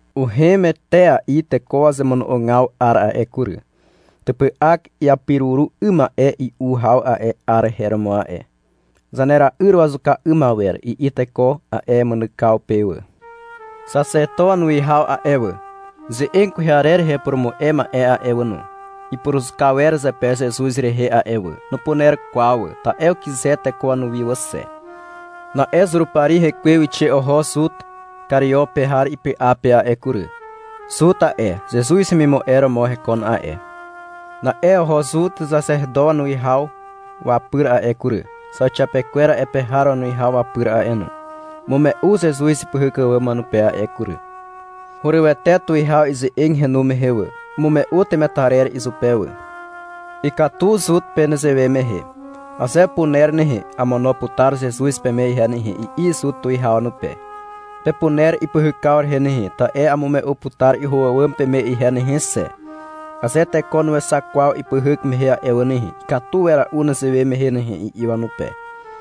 Uhem etea'i teko wazemono'ogaw 'ar a'e kury. Typy'ak iapiruru 'ym ma'e i'u haw a'e 'ar her romo a'e. (— Zanera'yr wazuka 'ym awer, i'i teko a'e mynykaw pe wà.) Xaxeto wanuwihaw a'e wà, ze'eg kwehe arer rehe upurumu'e ma'e a'e wà no, ipuruzuka wer zepe Zezuz rehe a'e wà. Nupuner kwaw wà, ta'e ukyze teko wanuwi wà xe. Na'e Zurupari hekwe wixe oho Zut Kario pe har ipy'a pe a'e kury. Zut a'e, Zezuz hemimu'e romo hekon a'e. Na'e oho Zut xaxeto wanuwihaw wapyr a'e kury, zauxiapekwer a'e pe har wanuwihaw wapyr a'e no. Umume'u Zezuz ipyhyk àwàm wanupe a'e kury. Hurywete tuwihaw ize'eg henu mehe wà. Umume'u temetarer izupe wà. Ikatu Zut pe nezewe mehe. — Aze apuner nehe, amono putar Zezuz peme ihe nehe, i'i Zut tuwihaw wanupe. — Pepuner ipyhykaw rehe nehe, ta'e amume'u putar iho àwàm peme ihe nehe xe. Aze teko nuexak kwaw ipyhyk mehe a'e wà nehe, ikatu wera'u nezewe mehe nehe, i'i wanupe.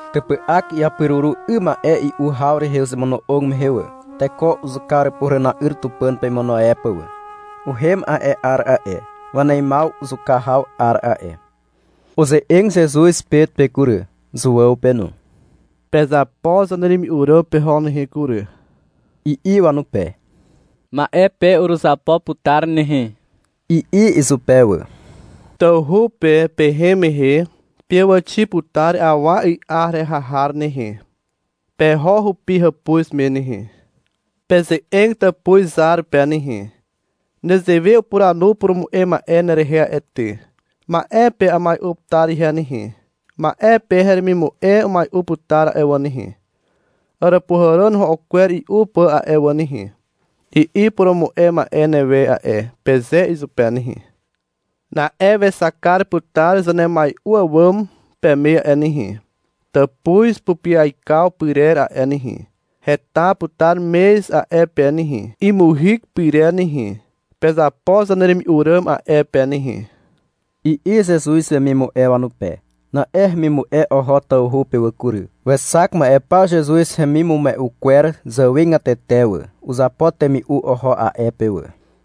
Typy'ak iapiruru 'ym ma'e i'u haw rehe uzemono'og mehe wà, teko uzuka àràpuhàràna'yr Tupàn pe imono e pà wà. Uhem a'e 'ar a'e, waneimaw zuka haw 'ar a'e. Uze'eg Zezuz Pet pe kury, Zuàw pe no. — Pezapo zaneremi'u ràm peho nehe kury, i'i wanupe. — Ma'e pe uruzapo putar nehe, i'i izupe wà. Tawhu pe pehem mehe peàwàxi putar awa 'y'a heraha har nehe. Peho hupi hàpuz me nehe. Peze'eg tàpuz zar pe nehe. Nezewe upuranu purumu'e ma'e nerehe a'e ty. — Ma'e pe amai'u putar ihe nehe, ma'e pe heremimu'e umai'u putar a'e wà nehe, àràpuhàràn ro'o kwer i'u pà a'e wà nehe, i'i purumu'e ma'e newe a'e, peze izupe nehe. Na'e wexak kar putar zanemai'u àwàm peme a'e nehe, tàpuz pupyaikaw pyrer a'e nehe. Heta putar mez a'e pe nehe, imuhyk pyrer nehe. Pezapo zaneremi'u ràm a'e pe nehe, i'i Zezuz wemimu'e wanupe. Na'e hemimu'e oho tawhu pe wà kury. Wexak ma'e paw Zezuz hemimume'u kwer zàwegatete wà. Uzapo temi'u oho a'e pe wà.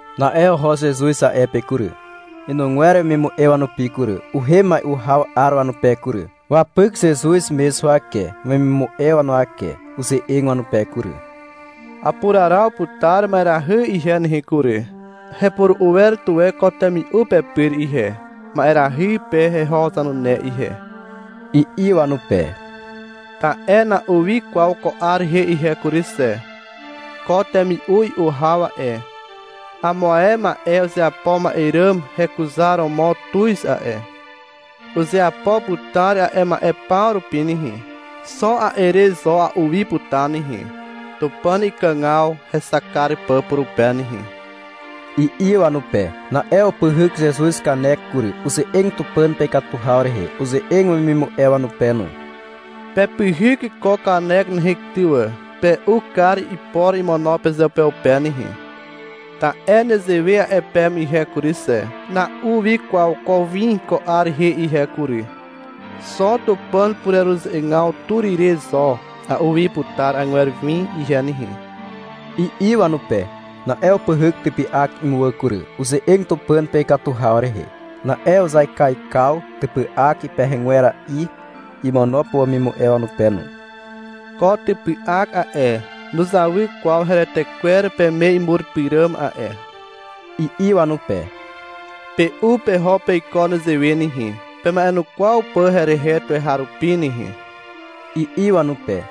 Na'e oho Zezuz a'e pe kury, inugwer wemimu'e wanupi kury. Uhem mai'u haw 'ar wanupe kury. Wapyk Zezuz mez huwake wemimu'e wanuwake. Uze'eg wanupe kury. — Apuraraw putar ma'erahy ihe nehe kury. Hepuru'u wer tuwe ko temi'u pepyr ihe, ma'erahy pe heho zanune ihe, i'i wanupe. — Ta'e na'u wi kwaw ko 'ar rehe ihe nehe kury xe. Ko temi'u i'u haw a'e, amo ae ma'e uzeapo ma'e ràm hekuzaromo tuz a'e. Uzeapo putar a'e ma'e paw rupi nehe. Xo a'e re zo a'u wi putar nehe, (Tupàn ikàgaw hexak kar pà purupe nehe), i'i wanupe. Na'e upyhyk Zezuz kanek kury. Uze'eg Tupàn pe ikatu haw rehe. Uze'eg wemimu'e wanupe no. — Pepyhyk ko kanek nehe ty wà, pe'u kar ipor imono pezeupeupe nehe. Ta'e nezewe a'e peme ihe kury xe, — Na'u wi kwaw ko win ko 'ar rehe ihe kury. Xo Tupàn pureruze'egaw tur ire zo a'u wi putar agwer win ihe nehe, i'i wanupe. Na'e upyhyk typy'ak imuwà kury. Uze'eg Tupàn pe ikatu haw rehe. Na'e uzaikaikaw typy'ak ipehegwera'i imono pà wemimu'e wanupe no. — Ko typy'ak a'e, nuzawy kwaw heretekwer peme imur pyràm a'e, i'i wanupe. — Pe'u peho peiko nezewe nehe, pema'enukwaw pà herehe tuweharupi nehe, i'i wanupe.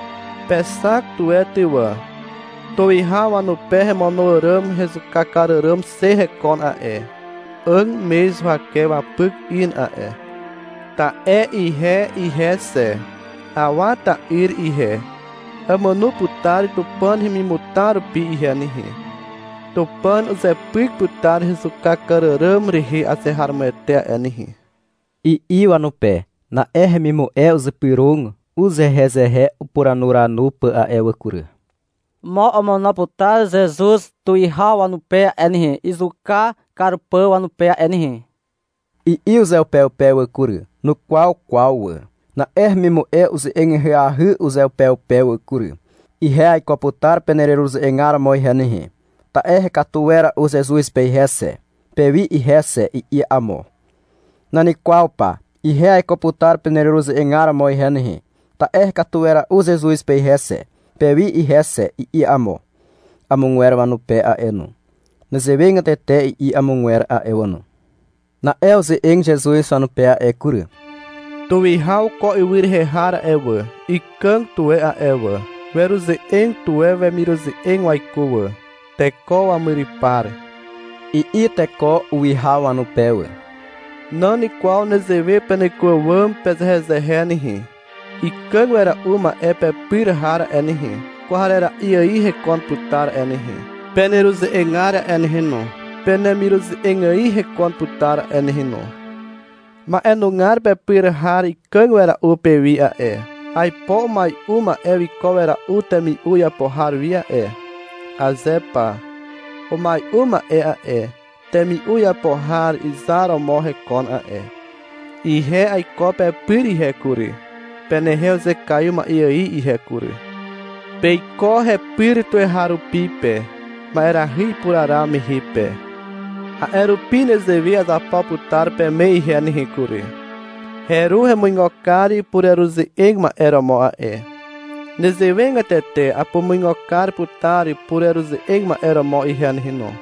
Pexak tuwe ty wà. Tuwihaw wanupe hemono àràm hezuka kar àràm xe hekon a'e. 'Àg mez huwake wapyk in a'e. Ta'e ihe ihe xe, Awa ta'yr ihe, àmàno putar Tupàn hemimutar rupi ihe nehe. Tupàn uzepyk putar hezuka kar àràm rehe azeharomoete a'e nehe, i'i wanupe. Na'e hemimu'e uzypyrog uzehezehe upuranuranu pà a'e wà kury. Mo omono putar Zezuz tuwihaw wanupe a'e nehe, izuka kar pà wanupe a'e nehe, i'i uzeupeupe wà kury. (Nukwaw kwaw wà.) Na'e hemimu'e uze'eg ahyahy uzeupeupe wà kury. — Ihe aiko putar peneruze'egar romo ihe nehe, ta'e hekatu wera'u Zezuz pe ihe xe, pewi ihe xe, i'i amo. — Nan kwaw pa, ihe aiko putar peneruze'egar romo ihe nehe, ta'e hekatu wera'u Zezuz pe ihe xe, pewi ihe xe, i'i amo, amogwer wanupe a'e no. Nezewegatete i'i amogwer a'e wà no. Na'e uze'eg Zezuz wanupe a'e kury. — Tuwihaw ko ywy rehe har a'e wà, ikàg tuwe a'e wà. Weruze'eg tuwe wemiruze'eg waiko wà. — Teko wamyrypar, i'i teko uwihaw wanupe wà. Nan kwaw nezewe peneko àwàm pezehezehe nehe. Ikàg wera'u ma'e pepyr har a'e nehe, kwarera'i ài hekon putar a'e nehe. Peneruze'egar a'e nehe no, penemiruze'eg ài hekon putar a'e nehe no. Ma'enugar pepyr har ikàg wera'u pewi a'e. Aipo umai'u ma'e wiko wera'u temi'u iapo har wi a'e. Aze pa. Umai'u ma'e a'e, temi'u iapo har izar romo hekon a'e. Ihe aiko pepyr ihe kury, penehe uzekaiw ma'e ài ihe kury. Peiko hepyr tuweharupi pe, ma'erahy ipuraraw mehe pe. A'e rupi nezewe azapo putar peme ihe nehe kury. Heru hemuigo kar pureruze'eg ma'e romo a'e. Nezewegatete apumuigo kar putar pureruze'eg ma'e romo ihe nehe no.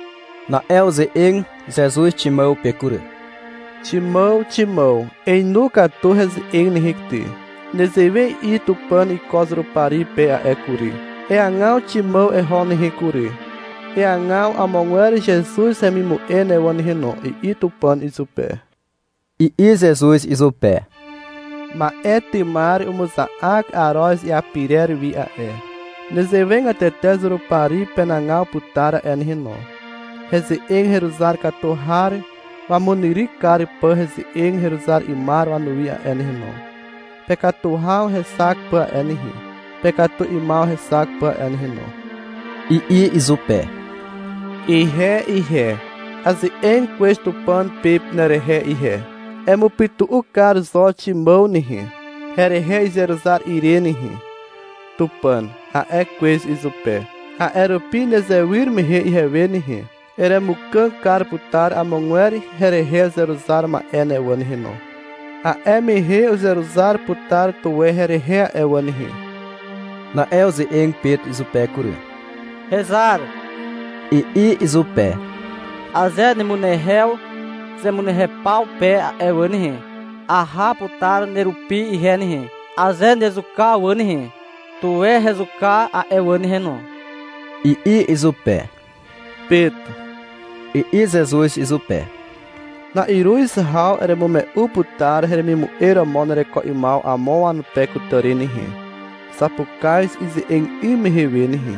Na'e uze'eg Zezuz Ximàw pe kury. Ximàw, Ximàw, einu katu heze'eg nehe ty. Nezewe i'i Tupàn iko Zurupari pe a'e kury. — Eagaw Ximàw eho nehe kury, eagaw amogwer Zezuz hemimu'e ne wà nehe no, i'i Tupàn izupe, i'i Zezuz izupe. — Ma'e tymar umuza'ak aroz iapirer wi a'e. Nezewegatete Zurupari penagaw putar a'e nehe no, heze'eg heruzar katu har wamunyryk kar pà heze'eg heruzar 'ymar wanuwi a'e nehe no, pekatu haw hexak pà a'e nehe, pekatu 'ymaw hexak pà a'e nehe no, i'i izupe. — Ihe ihe, aze'eg kwez Tupàn pe nerehe ihe. — Emupytu'u kar zo Ximàw nehe, herehe izeruzar ire nehe, Tupàn, a'e kwez izupe. — A'e rupi nezewyr mehe ihewe nehe, eremukàg kar putar amogwer herehe uzeruzar ma'e ne wà nehe no. A'e mehe uzeruzar putar tuwe herehe a'e wà nehe. Na'e uze'eg Pet izupe kury. Hezar, i'i izupe. — Aze nemunehew zemunehew paw pe a'e wà nehe, aha putar nerupi ihe nehe. Aze nezuka wà nehe, tuwe hezuka a'e wà nehe no, i'i izupe. — Pet, i'i Zezuz izupe. — Na'iruz haw eremume'u putar heremimu'e romo nereko 'ymaw amo wanupe kutàri nehe, zapukaz ize'eg 'ym mehe we nehe,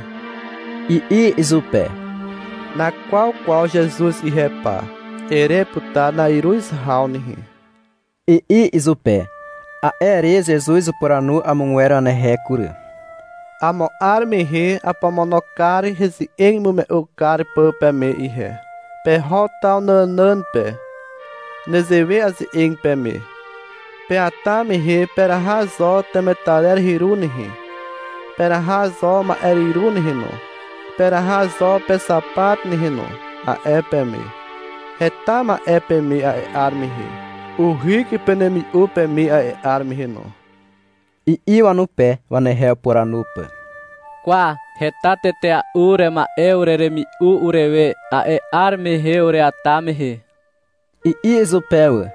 i'i izupe. — Nakwaw kwaw Zezuz ihe pa, ere putar na'iruz haw nehe, i'i izupe. A'e re Zezuz upuranu amogwer wanehe kury. Amo 'ar mehe apomono kar heze'eg imume'u kar pà peme ihe. Peho taw nànàn pe. Nezewe aze'eg peme. — Peata mehe peraha zo temetarer hyru nehe, peraha zo ma'eryru nehe no, peraha zo pexapat nehe no, a'e peme. — Heta ma'e peme a'e 'ar mehe. Uhyk penemi'u peme a'e 'ar mehe no, i'i wanupe, wanehe upuranu pà. — Kwa, heta tetea'u urema'e ureremi'u urewe, a'e 'ar mehe ureata mehe, i'i izupe wà.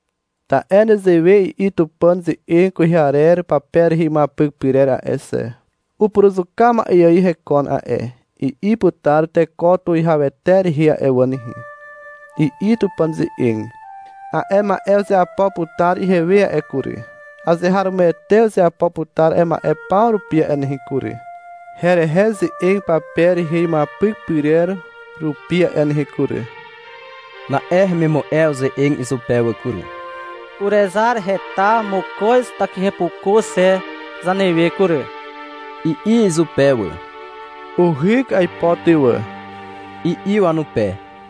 Ta'e nezewe i'i Tupàn ze'eg kwehe arer pape rehe imuapyk pyrer a'e xe. Upuruzuka ma'e ài hekon a'e, i'i putar teko tuwihawete rehe a'e wà nehe, i'i Tupàn ze'eg. A'e ma'e uzeapo putar ihewe a'e kury. Azeharomoete uzeapo putar a'e ma'e paw rupi a'e nehe kury, herehe ze'eg pape rehe imuapyk pyrer rupi a'e nehe kury. Na'e hemimu'e uze'eg izupe wà kury. — Urezar, heta mokoz takihepuku xe zanewe kury, i'i izupe wà. — Uhyk aipo ty wà, i'i wanupe.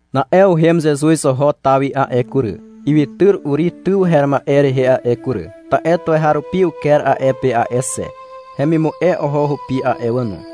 Na'e uhem Zezuz oho taw wi a'e kury, ywytyr Uri tyw her ma'e rehe a'e kury, ta'e tuweharupi uker a'e pe a'e xe. Hemimu'e oho hupi a'e wà no.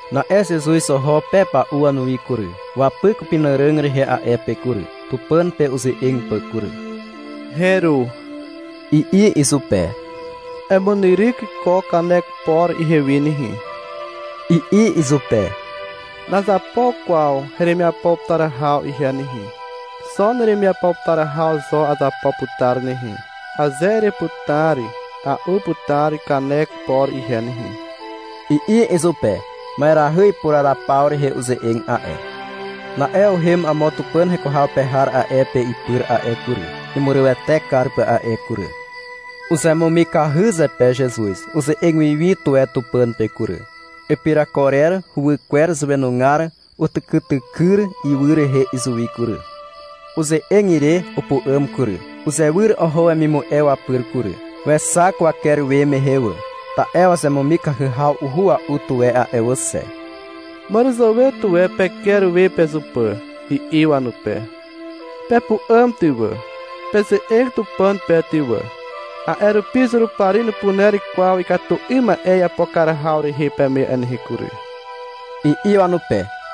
Na'e Zezuz oho pepa'u wanuwi kury. Wapyk upenàràg rehe a'e pe kury, Tupàn pe uze'eg pà kury. — Heru, i'i izupe. — Emunyryk ko kanek por ihewi nehe, i'i izupe. — Nazapo kwaw heremiapo putar haw ihe nehe. Xo neremiapo putar haw zo azapo putar nehe. Aze ereputar, a'u putar kanek por ihe nehe, i'i izupe. (Ma'erahy ipuraraw paw rehe uze'eg a'e.) Na'e uhem amo Tupàn heko haw pe har a'e pe ipyr a'e kury, imurywete kar pà a'e kury. Uzemumikahy zepe Zezuz. Uze'eg wiwi tuwe Tupàn pe kury. Ipirakorer huwykwer zàwenugar utykytykyr ywy rehe izuwi kury. Uze'eg ire, upu'àm kury. Uzewyr oho wemimu'e wapyr kury. Wexak waker we mehe wà. Ta'e wazemumikahy haw uhua'u tuwe a'e wà xe. — Màràzàwe tuwe peker we pezupà, i'i wanupe. — Pepu'àm ty wà, peze'eg Tupàn pe ty wà, a'e rupi Zurupari nupuner kwaw ikatu 'ym ma'e iapo kar haw rehe peme a'e nehe kury, i'i wanupe.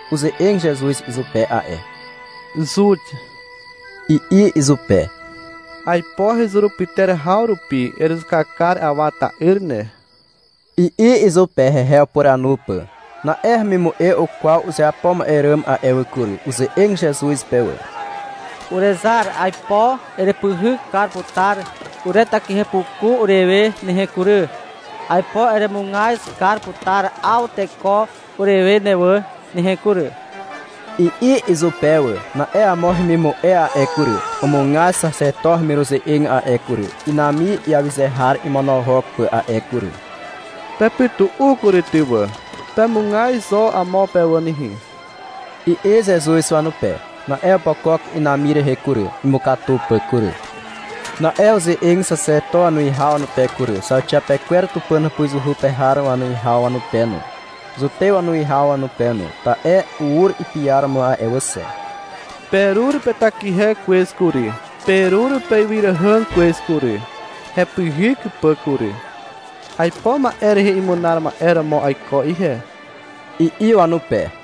Uze'eg Zezuz izupe a'e. Zut, i'i izupe. — Aipo hezurupyter haw rupi erezuka kar Awa ta'yr ne, i'i izupe, hehe upuranu pà. Na'e hemimu'e ukwaw uzeapo ma'e ràm a'e wà kury. Uze'eg Zezuz pe wà. Urezar, aipo erepyhyk kar putar uretakihe puku urewe nehe kury, aipo eremugaz kar putar 'aw teko urewe ne wà nehe kury, i'i izupe wà. Na'e amo hemimu'e a'e kury, umugaz xaxeto hemiruze'eg a'e kury, inami iawyze har imonohok pà a'e kury. — Pepytu'u kury ty wà, pemugaz zo amo pe wà nehe, i'i Zezuz wanupe. Na'e opokok inami rehe kury, imukatu pà kury. Na'e uze'eg xaxeto wanuwihaw wanupe kury, zauxiapekwer Tupàn hàpuzuhu pe har wanuwihaw wanupe no, Zutew wanuwihaw wanupe no. Ta'e ur ipiaromo a'e wà xe. Perur petakihe kwez kury, perur peywyràihàg kwez kury, hepyhyk pà kury. Aipo ma'e rehe imunar ma'e romo aiko ihe, i'i wanupe.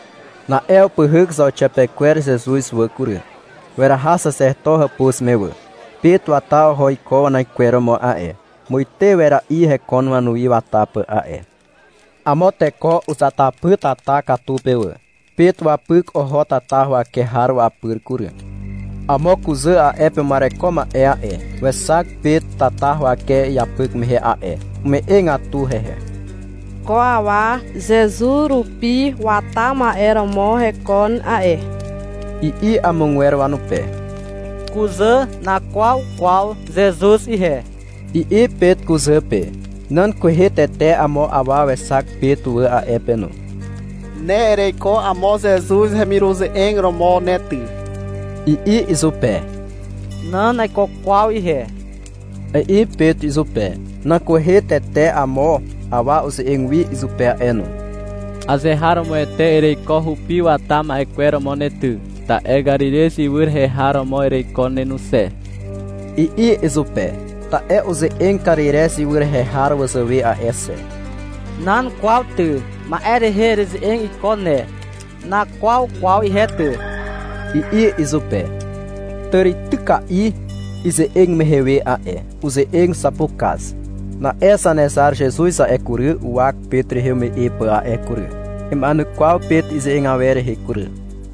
Na'e upyhyk zauxiapekwer Zezuz wà kury. Weraha xaxeto hàpuz me wà. Pet wata oho iko wanaikweromo a'e. Muite wera'i hekon wanuwi wata pà a'e. Amo teko uzatapy tata katu pe wà. Pet wapyk oho tata huwake har wapyr kury. Amo kuzà a'e pe uma'ereko ma'e a'e, wexak Pet tata huwake iapyk mehe a'e. Ume'egatu hehe. Ko awa Zezuz rupi wata ma'e romo hekon a'e, i'i amogwer wanupe. — Kuzà, nakwaw kwaw Zezuz ihe, i'i Pet kuzà pe. Nan kwehe tete amo awa wexak Pet wà a'e pe no. Ne ereiko amo Zezuz hemiruze'eg romo ne ty, i'i izupe. Nan, naiko kwaw ihe, i'i Pet izupe. Nan kwehe tete amo awa uze'eg wi izupe a'e no. Azeharomoete ereiko hupi wata ma'e kwer romo ne ty. Ta'e Karirez ywy rehe har romo ereiko ne no xe, i'i izupe. (Ta'e uze'eg Karirez ywy rehe har wazàwe a'e xe.) — Nan kwaw ty. Ma'e rehe ereze'eg iko ne. Nakwaw kwaw ihe ty, i'i izupe. Tàrityka'i, ize'eg mehe we a'e, uze'eg zapukaz. Na'e Zanezar Zezuz a'e kury, uwak Pet rehe ume'e pà a'e kury. Ima'enukwaw Pet ize'eg awer rehe kury.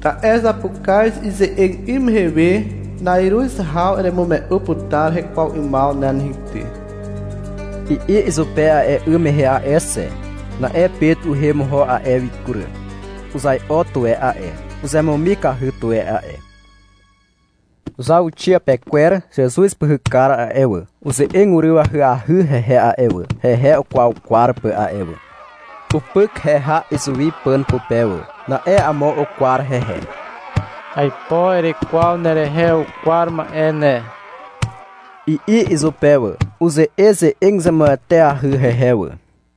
Ta'e — Zapukaz ize'eg 'ym mehe we, na'iruz haw eremume'u putar hekwaw 'ymaw ne nehe ty, i'i izupe a'e 'ym mehe a'e xe. Na'e Pet uhem oho a'e wi kury. Uzai'o tuwe a'e. Uzemumikahy tuwe a'e. Zauxiapekwer Zezuz pyhykar a'e wà, uze'eg uryw ahyahy hehe a'e wà, hehe ukwaukwar pà a'e wà. Upyk heha izuwi pàn pupe wà. Na'e amo ukwar hehe. — Aipo erekwaw nerehe ukwar ma'e ne, i'i izupe wà. Uze'eze'eg zemueteahy hehe wà.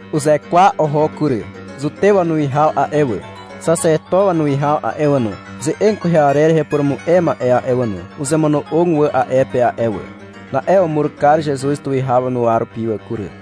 Uzekwa oho kury. Zutew wanuwihaw a'e wà, xaxeto wanuwihaw a'e wà no, ze'eg kwehe arer rehe upurumu'e ma'e a'e wà no, uzemono'og wà a'e pe a'e wà. Na'e umur kar Zezuz tuwihaw wanuwa rupi wà kury.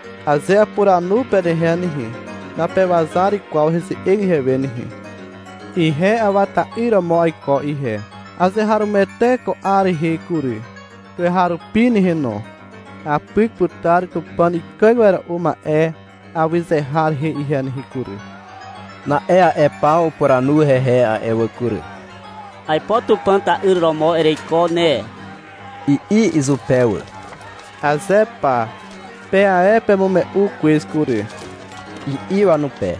Aze apuranu penehe nehe, napewazar kwaw heze'eg ihewe nehe. Ihe Awa ta'yr romo aiko ihe. Azeharomoete ko 'ar rehe kury, tuweharupi nehe no, apyk putar Tupàn Ikàg Wera'u Ma'e awyze har rehe ihe nehe kury. Na'e a'e paw upuranu hehe a'e wà kury. — Aipo Tupàn ta'yr romo ereiko ne, i'i izupe wà. — Aze pa. Pe ae pemume'u kwez kury, i'i wanupe.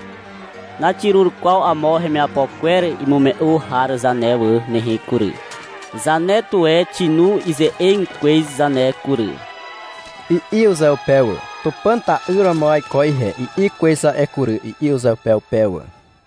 — Naxirur kwaw amo hemiapo kwer imume'u har zane wà nehe kury. Zane tuwe xinu ize'eg kwez zane kury, i'i uzeupe wà. (-Tupàn ta'yr romo aiko ihe, i'i kwez a'e kury, i'i uzeupeupe wà.)